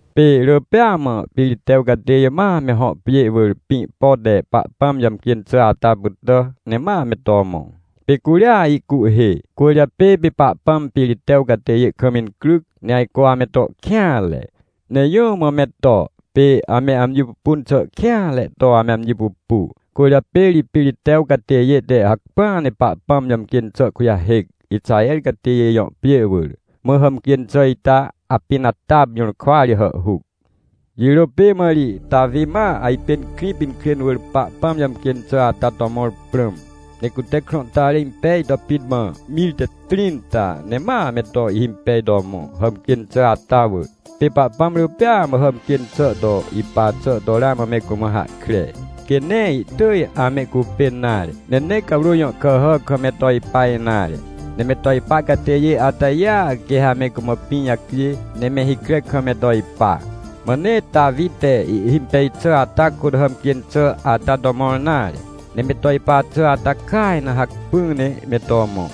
Pê rỳ pêa mã Piritew catêjê ma me hõ pjê wỳr pĩ pote Pahpãm jàmcjên xà ata pytà ne mame to mõ, pê curia ihcuhhê. Cwỳrjapê pê Pahpãm Piritew catêjêkam incryc, ne ajco ameto kêanre. Ne jũ mã me to, pê ame amji pupun xà kêanre to ame amji pupu. Cwỳrjapê ri Piritew catêjê te hacpỹa ne Pahpãm jàmcjên xàkujahêc, Ixaher catêjê jõ pjê wỳr. Mã hàmcjên xà ita Apinatapjũrkwa ri hàhhuc. Jirô pê mã ri Tawi, ma ajpên Krĩpinkrên wỳrPahpãm jàmcjên xà ata to mõr prãm. Ne cute krãhtare impej to pit mã mir te trĩnta ne ma me to ihhimpej to mõ, hàmcjên xà ata wỳr. Pê Pahpãm rỳ pêa mã hàmcjên xà to ipa xà to ramã me cumã hahkre. Quê nee ihtỳj amehcupên nare, ne nee cawrô jõ kàhà kam me to ipa nare. Ne me to ipa catêjê atajêa, quê ha me cumã pĩ jacjê, ne me hikre kam me to ipa. Mã nee Tawi te ihhimpej xà ata kôt, hàmcjên xà ata to mõr nare. Ne me to ipa xà ata kaj na hacpỹ ne me to mõ.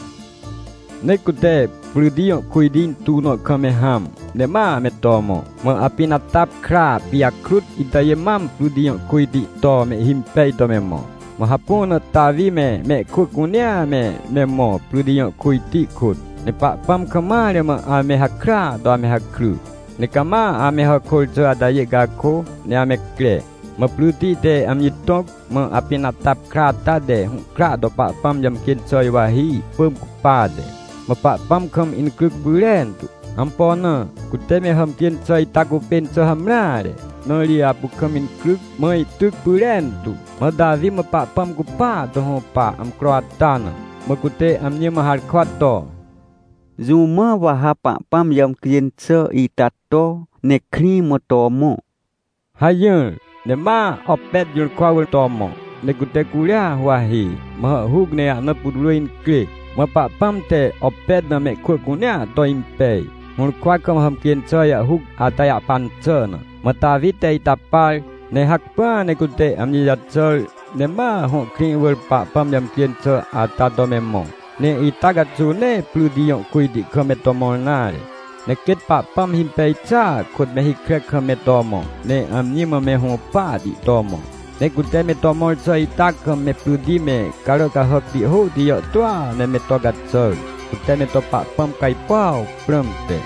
Ne cute pryti jõkujti intuw nõ kam me hãm, ne ma me to mõ. Mã Apinatap kra pijakrutitajê mam pryti jõ kujti to mehhimpej to me mõ. Mã hapu na Tawi me, mehkwỳ cunea me, me mõ, pryti jõ kujti kôt. Ne Pahpãm kam mare mã amehakrya to ame hakry, ne cama ame hàkôr xà atajê cakô, ne ame cre. Mã pryti te amji tõc, mã Apinatap kra ata te hũhkra to Pahpãm jàmcjên xà juwahi, ihpỳm cupate. Mã Pahpãm kam incryc pyrentu. Ampo na? Cute me hàmcjên xà ita cupên xà hamreare, na ri apu kam incryc, mã ihtyc pyrentu. Mã Tawi mã Pahpãm cupaa to hũpa, amcro atana, mã cute amji mã harkwa to: — Jũ mã wa ha Pahpãm jàmcjên xà ita to, ne krĩ mã to mõ? — hajỹr. Ne ma Opet jũrkwa wỳr to mõ, ne cute curia huwahi, mã hàhhuc ne ahna putwrỳ incrê. Mã Pahpãm te Opet na mehkwỳ cunea to impej, hũrkwa kam hàmcjên xà jàhhuc ata jahpan xà na. Mã Tawi te ita par, ne hacpỹa ne cute amji jaxàr, ne ma hõ krĩ wỳrPahpãm jàmcjên xà ata to me mõ. Ne ita caxuw nee pryti jõ kujti kam meto mõr nare, ne quêt Pahpãm himpej xàa kôtme hikre kam me to mõ, ne amji mã me hũpahti to mõ. Ne cute me to mõr xà ita kamme pryti me, carà cahàcti hôhti jàhtôa ne me to caxàr, cute me to Pahpãm cajpuaw prãmte.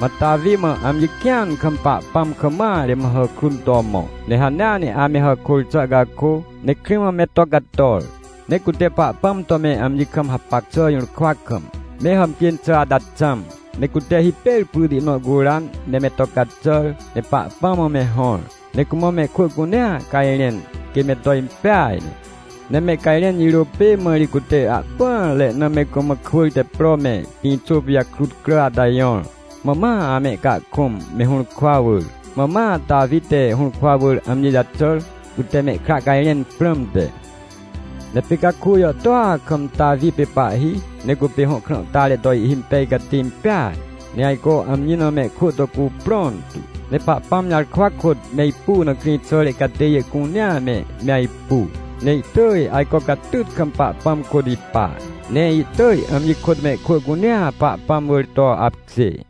Mã Tawi mã amji kĩan kam Pahpãm kam mare mã hàkrun to mõ. Ne hanea neame hàkôr xà cakô, ne krĩ mã me to cator. Ne cute Pahpãm to me amjikam hapac xà jũrkwa kam, me hàmcjên xà ata xãm. Ne cute hipêr prytinõ curan, ne me to caxàr, ne Pahpãm mã me hõr. Ne cumã mehkwỳ cunea cajrẽn, quê me to impeaj ne. Ne mehcajrẽn jirô pêmã ri cute ahpỹanre na me cumã kwỳr te pro me, pĩxô pijakrut crà ata jõr. Mã ma ame cahkũm, mehũrkwa wỳr. Mã ma Tawi te hũrkwa wỳr amjijaxàr, cute mehkra cajrẽn prãmte. Ne pê caku jàhtôa kam Tawi pê pahhi, ne cupê hõ krãhtare to ihhimpejcatê impeaj. Ne ajco amji na mehkwỳ to cuprõn tu, ne Pahpãm jarkwa kôt me ipu na krĩxàre catêjê cuneame, me ajpu. Ne ihtỳj ajco catyt kam Pahpãm kôt ipa, ne ihtỳj amji kôtmehkwỳ cunea Pahpãm wỳr to apkjê.